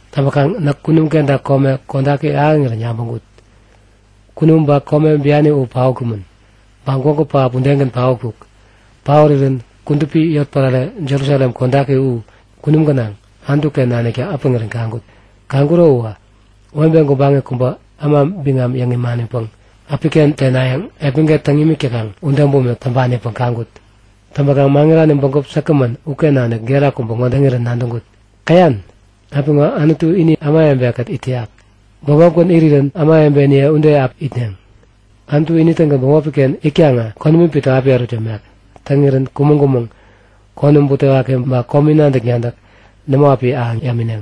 Täŋpäkaŋ näk kunum kenta kome kodaki ahäŋirän yabäŋkut. Kunum ba kome biani u paotkumän. Ba gwägu pähap udegän paotkuk. Paorirän kudupi yotpärare, Jerusalem kodaki u, kunum gänaŋ, Anutu-ken naniktä äpäŋirän kaŋkut. Kaŋkuro uwä webe gubaŋi kubä äma biŋam yäŋ imanipäŋ äpiken tenayäŋ epmäget täŋ yämik täkaŋ ude bumik täŋpanipäŋ kaŋkut. Täŋpäkaŋ maŋirani bägup säkgämän uken nanik gera kubä ŋode yäŋirän nadäŋkut; Käyan? Apiŋo Anutu ini ämawebe-kät it täyak. Bämopgän irirän ämawebeniye ude api itneŋ. Anutu ini-tägän bämopi-ken itkaŋä konämi pito api ärut yämek. Täŋirän kumäŋ-kumäŋ, konäm butewaki ba komi nadäk-nadäk, nämo api ahäŋ yämineŋ.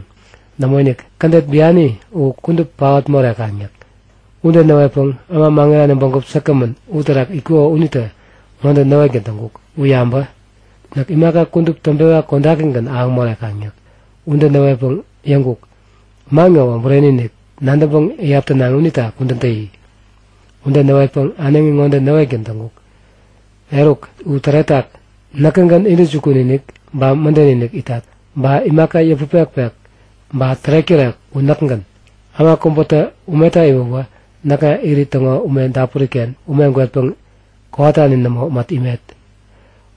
Nämoinik, kädet biani u kudup paot morekaŋ yäk. Ude näwetpäŋ äma maŋirani bägup säkgämän uterak itkuko unitä ŋode näwetgän täŋkuk; U yabä! Näk imaka kudup täŋpewa kodakigän ahäŋ morekaŋ yäk. Ude näwetpäŋ yäŋkuk; Man ŋowä bureni-inik, nadäŋpäŋ iyap tänaŋi unita kudän täyi! Ude näwetpäŋ äneŋi ŋode näwetgän täŋkuk; Eruk, u täretak! Näkägän intäjukun-inik ba mäden-inik itat. Ba imaka yäput-pekpek ba tärek-tärek u näkgän. Äma kubätä umeta iwäwä näkŋa Irit täŋo ume dapuri-ken ume gwetpäŋ kowatani nämo mät imet.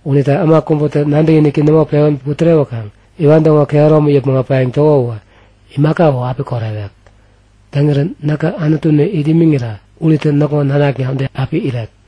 Unita äma kubätä nadäkiniki nämo pewän putärewäkaŋ iwan täŋo kehäromi yäpmäŋ äpayäŋ täko uwä imaka u api korewek. Täŋirän näkä Anutuni it imiŋira unitä näkŋo nanakna ude api irek.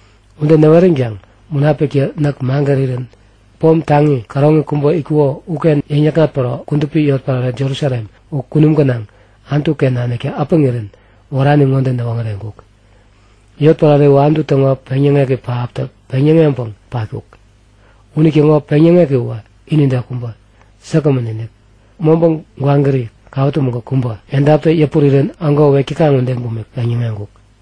Ude näweränkaŋ Munapiktä näk magärirän pom taŋi käroŋi kubä itkuko uken yäŋnäkŋat päro kudupi yotpärare Jerusalem u kunum gänaŋ, Anutu-ken naniktä äpäŋirän wärani ŋode näwoŋäreŋkuk; Yotpärare u Anutu täŋo peŋyäŋek pähaptä peŋyäŋeŋpäŋ patkuk. Unitäŋo peŋyäŋeki uwä inide kubä, säkgämän-inik. Mobä gwagäri, kawä tumäŋ-kuk kubä, edaptä yäpurirän ägo wek täkaŋ ude bumik peŋyäŋeŋkuk.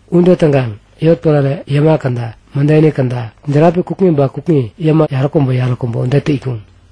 Ude täŋkaŋ yotpärare yäma käda, mädeni käda, järapi kukŋi ba kukŋi yäma yaräkubä-yaräkubä udetä itkuŋ.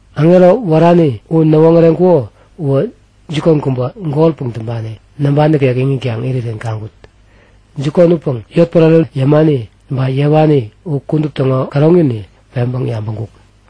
Aŋero wärani u näwoŋäreŋkuko uwä jikon kubä, golpäŋ täŋpani, namba nikek iŋitkaŋ irirän kaŋkut. Jikon upäŋ yotpärare yämani ba yewani u kudup täŋo käroŋini peŋpäŋ yabäŋkuk.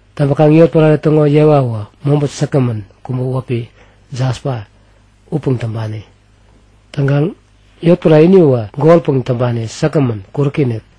Täŋpäkaŋ yotpärare täŋo yewa uwä mobä säkgämän kubä wäpi jaspa upäŋ täŋpani. Täŋkaŋ yotpärare ini uwä golpäŋ täŋpani säkgämän, kuräki-inik.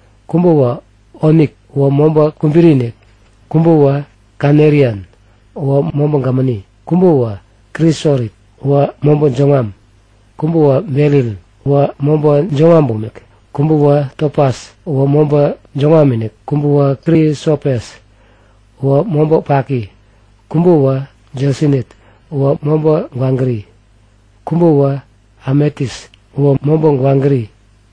Kubäwä onik, uwä mobä kubiri-inik. Kubäwä kanelian, uwä mobä gämäni. Kubäwä krisorit, uwä mobä jäŋwam. Kubäwä beril, uwä mobä jäŋwam bumik. Kubäwä topas, uwä mobä jäŋwam-inik. Kubäwä krisopes, uwä mobä paki. Kubäwä jesinit, uwä mobä gwagäri. Kubäwä ametis, uwä mobä gwagäri.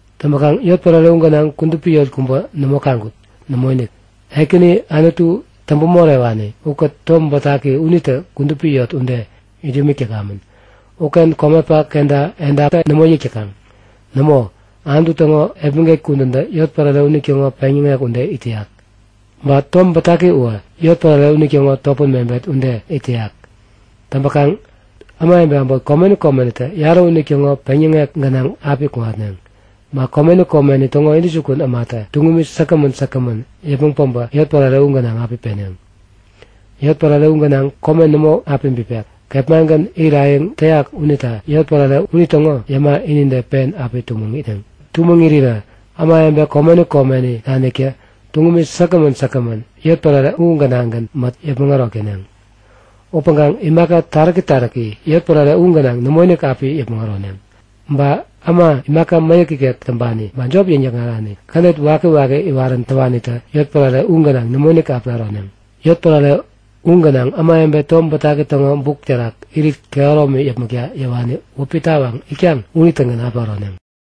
Täŋpäkaŋ yotpärare u gänaŋ kudupi yot kubä nämo kaŋkut. Nämoinik. Ekäni Anutu täŋpä-morewani ukät Tom Bätaki unitä kudupi yot ude it yämik täkamän. Uken komepak kenta edapta nämo yäk täkaŋ. Nämo, Anutu täŋo epmäget kudäntä yotpärare unitäŋo peŋyäŋek ude it täyak. Ba Tom Bätaki uwä yotpärare unitäŋo topän mebet ude it täyak. Täŋpäkaŋ ämawebe äbot komeni komenitä yarä unitäŋo peŋyäŋek gänaŋ api kuŋatneŋ. Ba komeni komeni täŋo intäjukun ämatä tuŋumi säkgämän säkgämän yäpmäŋ päbä yotpärare u gänaŋ api peneŋ. Yotpärare u gänaŋ kome nämo api bipek. Kepmagän irayäŋ täyak unita yotpärare unitäŋo yäma inide pen api tumäŋ itneŋ. Tumäŋ irirä ämawebe komeni komeni naniktä tuŋumi säkgämän säkgämän yotpärare u gänaŋgän mät yäpmäŋ ärok täneŋ. Upäŋkaŋ imaka taräki taräki yotpärare u gänaŋ nämoinik api yäpmäŋ äroneŋ. Ba äma imaka mäyäk ikek täŋpani ba jop yäŋ-yäkŋarani kädet wakiwaki iwarani udewanitä yotpärare u gänaŋ nämoinik api äroneŋ. Yotpärare u gänaŋ ämawebe Tom Bätaki täŋo buk terak irit kehäromi yäpmäkta yäwani wäpi tawaŋ itkaŋ unitägän api äroneŋ.